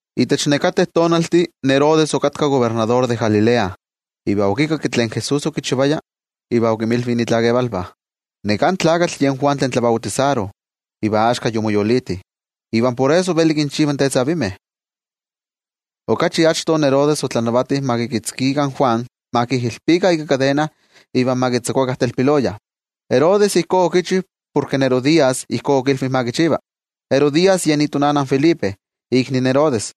Itech nekateh tonaltih Herodes okatka kobernador de Galilea, iva okikakki tlen Jesús okichivaya, iva okinmilvi itlakevalvah: —Neká tlakatl yen Juan tlen tlabautisaro iva axka yomoyoliti. Iva por eso veli kinchiva tetzavimeh. Okachi achto Herodes otlanavati ma kikitzkikah in Juan, ma kijilpikah ika kadena iva ma kitzakuakah telpiloya. Herodes ijkó okichi porke Herodías ijkó okilvi ma kichiva. Herodías yen itonana in Felipe, ikni in Herodes.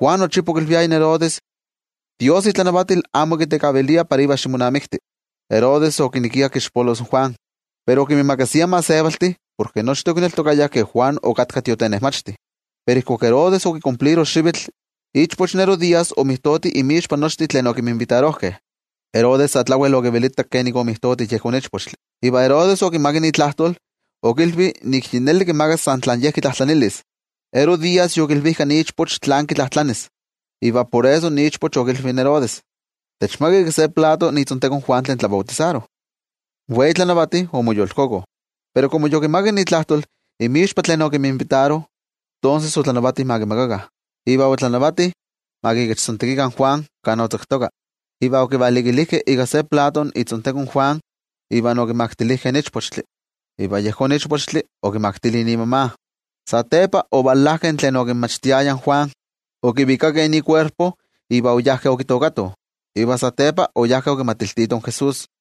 Juan nochipa okilviaya in Herodes: —Dios itlanavatil amo kitekavilia para ivan ximonamikti in Herodías. Herodes okinekia kixpolos in Juan, pero okinmiimakasia in gentejtih porke nochtin okineltokayah ke Juan okatka tiotenejmachti. Pero ijkuak Herodes okikumpliro xivitl, ichpoch in Herodías omijtoti inmixpa nochtin tlen okinminvitarojkeh. Herodes sa tlawel okivelitak kenik omijtoti yejón ichpochtli. Iva Herodes okimakak itlajtol okilvi nik yi neli kimakas san tlen ye kitlajtlanilis. Herodías yokilvijka ichpoch tlán kitlajtlanis iva por eso okilvi in Herodes: —Techmaka ika se plato itzonteko in Juan tlen tlabautisaro. In wei tlanavati omoyolkoko. Pero komo yokimakak itlajtol inmixpa tlen okinminvitaro, tonses otlanavati ma kimakakah. Iva otlanavati ma kikechtzontekikah in Juan kan otzaktoka, iva okivalikilijkeh ika se plato itzonteko in Juan iva okimaktilijkeh in ichpochtli, iva yejón ichpochtli okimaktili imama. Satepa ovalajkeh tlen okinmachtiaya in Juan, okivikakeh ikuerpo iva oyajkeh okitookatoh, iva satepa oyajkeh okimatiltitoh in Jesús.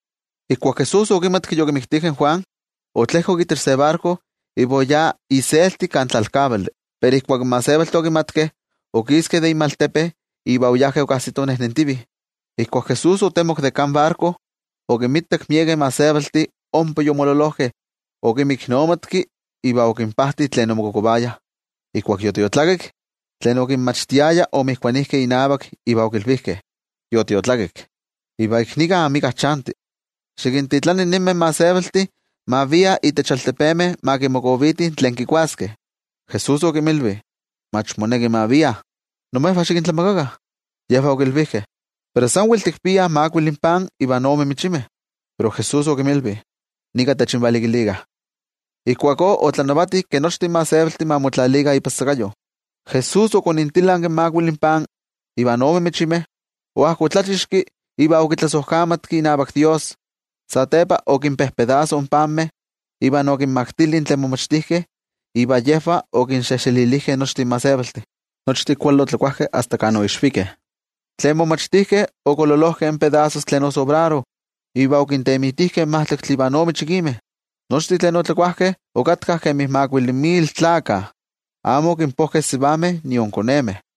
Ijkuak Jesús okimatki yokimiktijkeh in Juan, otlejkok itech se barko iva oyá iselti kan tlalkavali. Pero ijkuak in gentejtih okimatkeh, okiskeh de inmaltepe iva oyajkeh okajsitoh nejnentivih. Ijkuak Jesús otemok de itech barko, okinmitak miekeh gentejtih ompa yomololojkeh, okinmiknomatki iva okinpajti tlen omokokovayah. Ijkuak yotiotlakik, tlen okinmachtiaya omotokijkeh inavak iva okilvijkeh: —Yotiotlakik, iva ik nika amika chanti. Xikintitlani ninmeh gentejtih ma viah itech altepemeh ma kimokovitih itla tlen kikuaskeh. Jesús okinmilvi: —Mach moneki ma viah, imejvah xikintlamakakah. Yejvah okilvijkeh: —Pero tikpiah san makuili pan iva ome michimeh. Pero Jesús okinmilvi: —Nika techinvalikilikah. Ijkuakó otlanavati ke nochtin gentejtih ma motlajtlalikah ipan sakayo. Jesús okontilanki in makuili pan ivan ome michimeh, oajkotlachixki iva okitlasojkamatki inavak Dios. Satepa okinpojpostekki in panmeh iva okinmaktili tlen momachtijkeh iva yejvah okinxejxelilijkeh nochtin gentejtih. Nochtin kuali otlakuajkeh asta kan oixvikeh. Tlen momachtijkeh okololojkeh in pedasos tlen osobraro iva okintemitijkeh majtlaktli ivan ome chikimeh. Nochtin tlen otlakuajkeh okatkah kemi makuili mil tlakah, amo okinpojkeh in sivameh nion konemeh.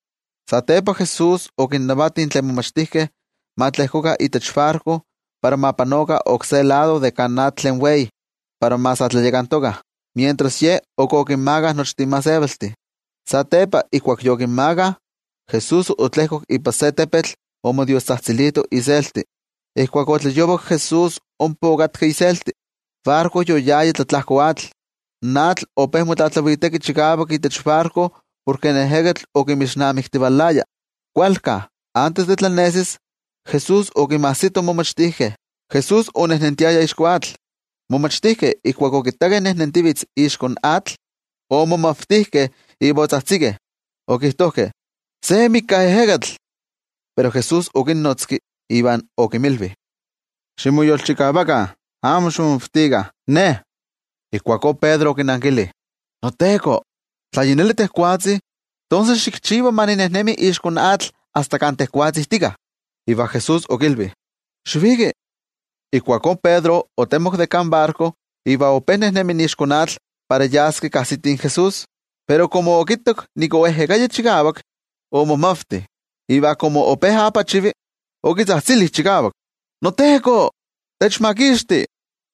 Satepa, Jesús okinnavati tlen momachtijkeh ma tlejkokah itech barko para ma panokah oksé lado de kan atl tlen wei para ma sa tlayakantokah, mientras Ye ok okinmakah nochtin gentejtih. Satepa, ijkuak yokinmakah, Jesús otlejkok ipan se tepetl omodiostzajtzilito iselti. Ijkuak otlayovak Jesús ompa okatka iselti. In barko yoyaya tlatlajko atl. In atl ope motlatlaviteki chikavak itech barko porke in ejekatl okinmixnamiktivalaya. Kualka antes de tlanesis, Jesús okinmajsito in momachtijkeh, Jesús onejnentiaya ixko atl. In momachtijkeh ijkuak okittakeh nejnentivitz ixko atl, omomavtijkeh iva otzajtzikeh, okijtojkeh: —¡Se mika ejekatl! Pero Jesús okinnotzki iva okinmilvi: —¡Ximoyolchikavakah, amo ximomavtikah, Ne niJesús! Ijkuakó Pedro okinankili: —NoTeko, tla yi neli tejwatzi, tonses xikchiva ma ninejnemi ixko atl asta kan tejwatzi tika. Iva Jesús okilvi: —Xiviki. Ijkuakó Pedro otemok de kan barko iva ope nejnemi ixko atl para yas kajsiti in Jesús. Pero komo okittak nik oejekaya chikavak, omomavti. Iva komo ope poolaki, okitzajtzili chikavak: —¡NoTeko, techmakixti!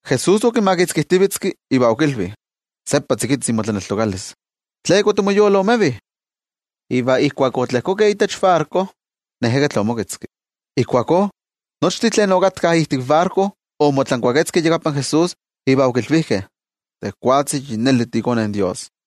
Jesús okimakitzkijtivetzki iva okilvi: —¡Seppa tzikitzi motlaneltokalis! ¿Tleka otimoyoloomevi? Iva ijkuak otlejkokeh itech barko, in ejekatl omoketzki. Ijkuakó, nochtin tlen okatkah ijtik barko omotlankuaketzkeh iyakapan Jesús iva okilvijkeh: —Tejwatzi yi neli tiiKone in Dios.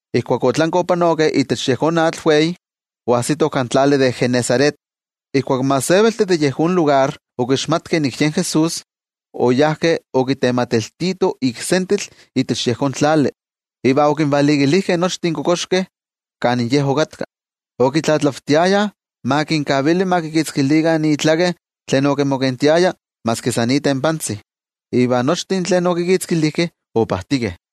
Ijkuak otlankeh opanokeh itech yejón atl tlen wei, oajsitoh kan tlali de Genesaret. Ijkuak in gentejtih de yejón lugar okixmatkeh nik yen Jesús, oyajkeh okitematiltitoh sentetl itech yejón tlali, iva okinvalikilijkeh nochtin kokoxkeh kan Ye okatka. Okitlatlavtiayah ma kinkavili ma kikitzkilikah itlaken tlen kimokentia maski san itempa. Iva nochtin tlen okikitzkilijkeh, opajtikeh.